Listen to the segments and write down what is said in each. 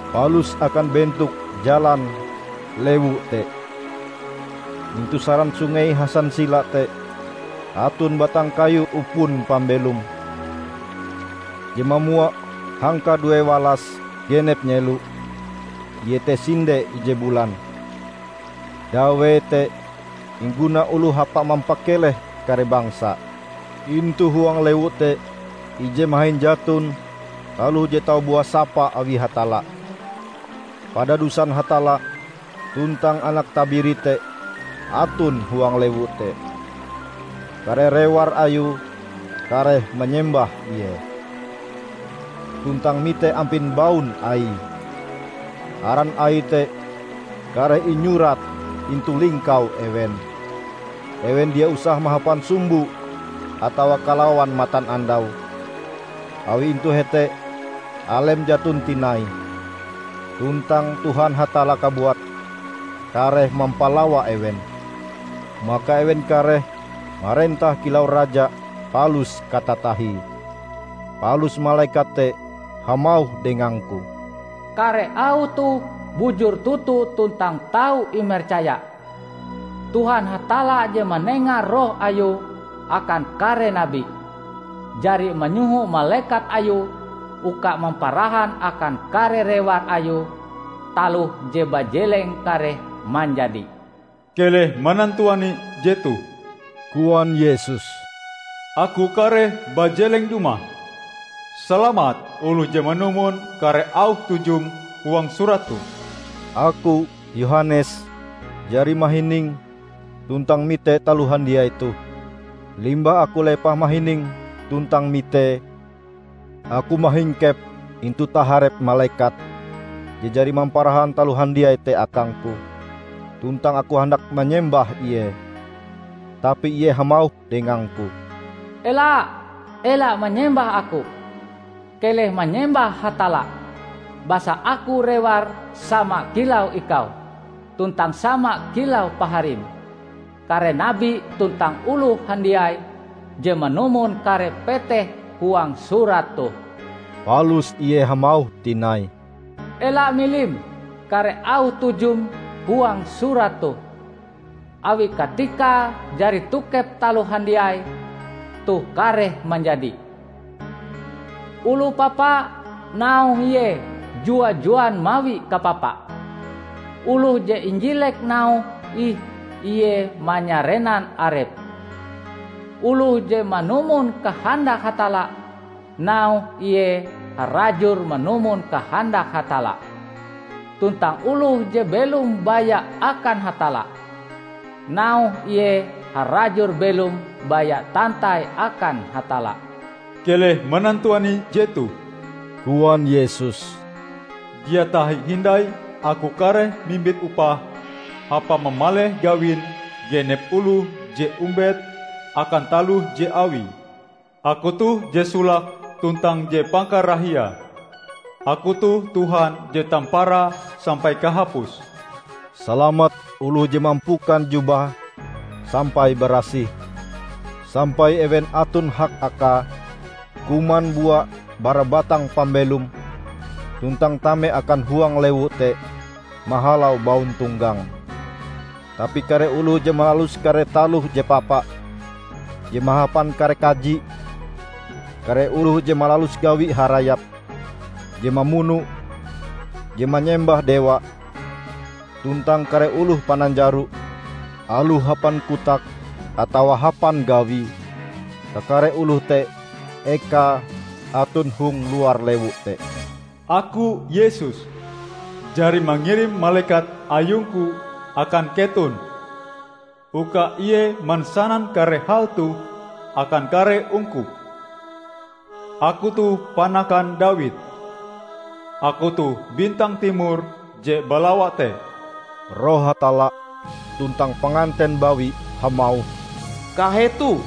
palus akan bentok jalan lewu te. Intu saran sungei hasansila te aton batang kayu upon pambelom, je mamua hangka duewalas genep nyelo, iete sinde ije bulan. Dawee te ingguna oloh hapa mampakeleh kare bangsa. Intu huang lewu te ije mahin jaton taloh je tau buah sapa awi Hatalla. Padadusan Hatalla tuntang Anak Tabiri te aton huang lewu te. Kare rewar Ayue kareh manyembah Ie, tuntang mite ampin baun Aie. Aran Aie te kareh inyurat intu lingkau ewen. Ewen dia usah mahapan sumbo atawa kalawan matanandau, awi intu hete alem jaton tinai, tuntang Tuhan Hatalla kabuat kareh mampalawa ewen. Maka ewen kareh marentah kilau raja palus katatahie. Palus malekat te hamauh dengangku, "Kare auh toh bujur toto tuntang tau imercaya. Tuhan Hatalla je manenga Roh Ayue akan kare nabi, jari manyoho malekat Ayue uka mamparahan akan kare rewar Ayue taloh je bajeleng kareh manjadi." "Keleh manantuani jetoh!" koan Yesus, "Aku kareh bajeleng dumah. Salamat oloh je manumon kare auh tujum huang surat toh!" Aku Yohanes jari mahining tuntang mite taloh handiai toh. Limbah aku lepah mahining tuntang mitee, aku mahingkep intu taharep malekat je jari mamparahan taloh handiai te akangku, tuntang aku handak manyembah ie, tapi ie hamauh dengangku, "Ela! Ela manyembah aku! Keleh manyembah Hatalla! Basa aku rewar sama kilau ikau, tuntang sama kilau paharim, kare nabi tuntang oloh handiai je manumon kare peteh huang surat toh!" Palus ie hamauh tinai, "Ela milim kare auh tujum huang surat toh, awi katikae jari tokep taloh handiai toh kareh manjadi. Oloh papa, nauhe ie jua-juan mawi kapapa; oloh je injilek nauhe ih ie manyarenan arepe; oloh je manumon kahandak Hatalla, nauhe ie harajur manumon kahandak Hatalla, tuntang oloh je belom baya akan Hatalla, nauhe ie harajur belom baya tantai akan Hatalla." "Keleh manantuani jetoh!" koan Yesus, "Dia tahi hindai aku kareh mimbit upah hapa mamaleh gawin genep oloh je ombet akan taloh je awie. Aku toh je solake tuntang je pangkarahiae; aku toh Tuhan je Tamparae sampai Kahapuse." Salamat oloh je mampukan jubahe sampai barasih sampai ewen aton hak akae kuman bua bara batang pambelom tuntang tame akan huang lewu te mahalau bauntonggange. Tapi kare oloh je malalus kare taloh je papa, je mahapan kare kaji, kare oloh je malalus gawi harayap, je mamuno, je manyembah dewa, tuntang kare oloh pananjaro, aloh hapan kotake atawa hapan gawie, kakare oloh te ekae aton hong luar lewu te. "Aku, Yesus, jari mangirim malekat ayung-Ku akan keton uka ie mansanan kare hal toh akan kare ungkup. Aku toh panakan Dawid; aku toh bintang timor je balawa te." Roh Hatalla tuntang Panganten Bawi hamauh, "Kahetoh!"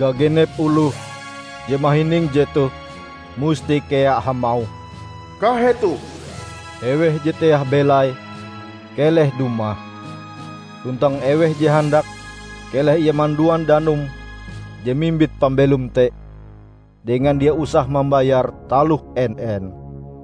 Gagenep oloh je mahining jetoh musti kea hamauh, "Kahetoh!" Eweh je teah belaie, keleh dumah! Tuntang eweh je handak, keleh ie manduan danum je mimbit pambelom te dengan dia usah mambayar taloh en-en.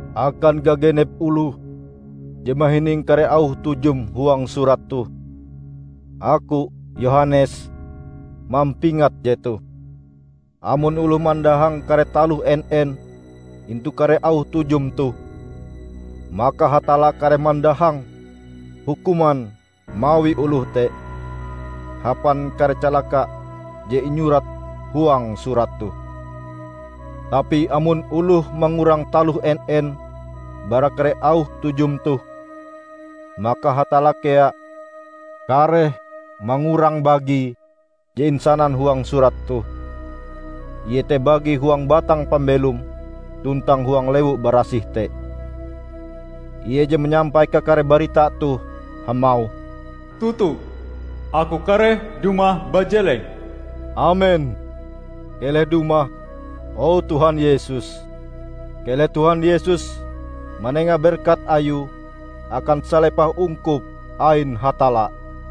Akan gagenep oloh je mahining kare auh tujum huang surat toh, aku Yohanes, mampingat jetoh: amon oloh mandahang kare taloh en-en intu kare auh tujum toh, maka Hatalla kareh mandahang hukuman mawi oloh te hapan kare calaka je inyurat huang surat toh. Tapi amon oloh mangurang taloh en-en bara kare auh tujum toh, maka Hatalla kea kareh mangurang bagie je insanan huang surat toh -- iete bagie huang batang pambelom tuntang huang lewu barasih te. Ie je manyampai kakare barita toh hamauh, "Toto, Aku kareh dumah bajeleng!" Amen! Keleh dumah, o Tuhan Yesus! Keleh Tuhan Yesus manenga berkat Ayue akan salepah ungkup ain Hatalla!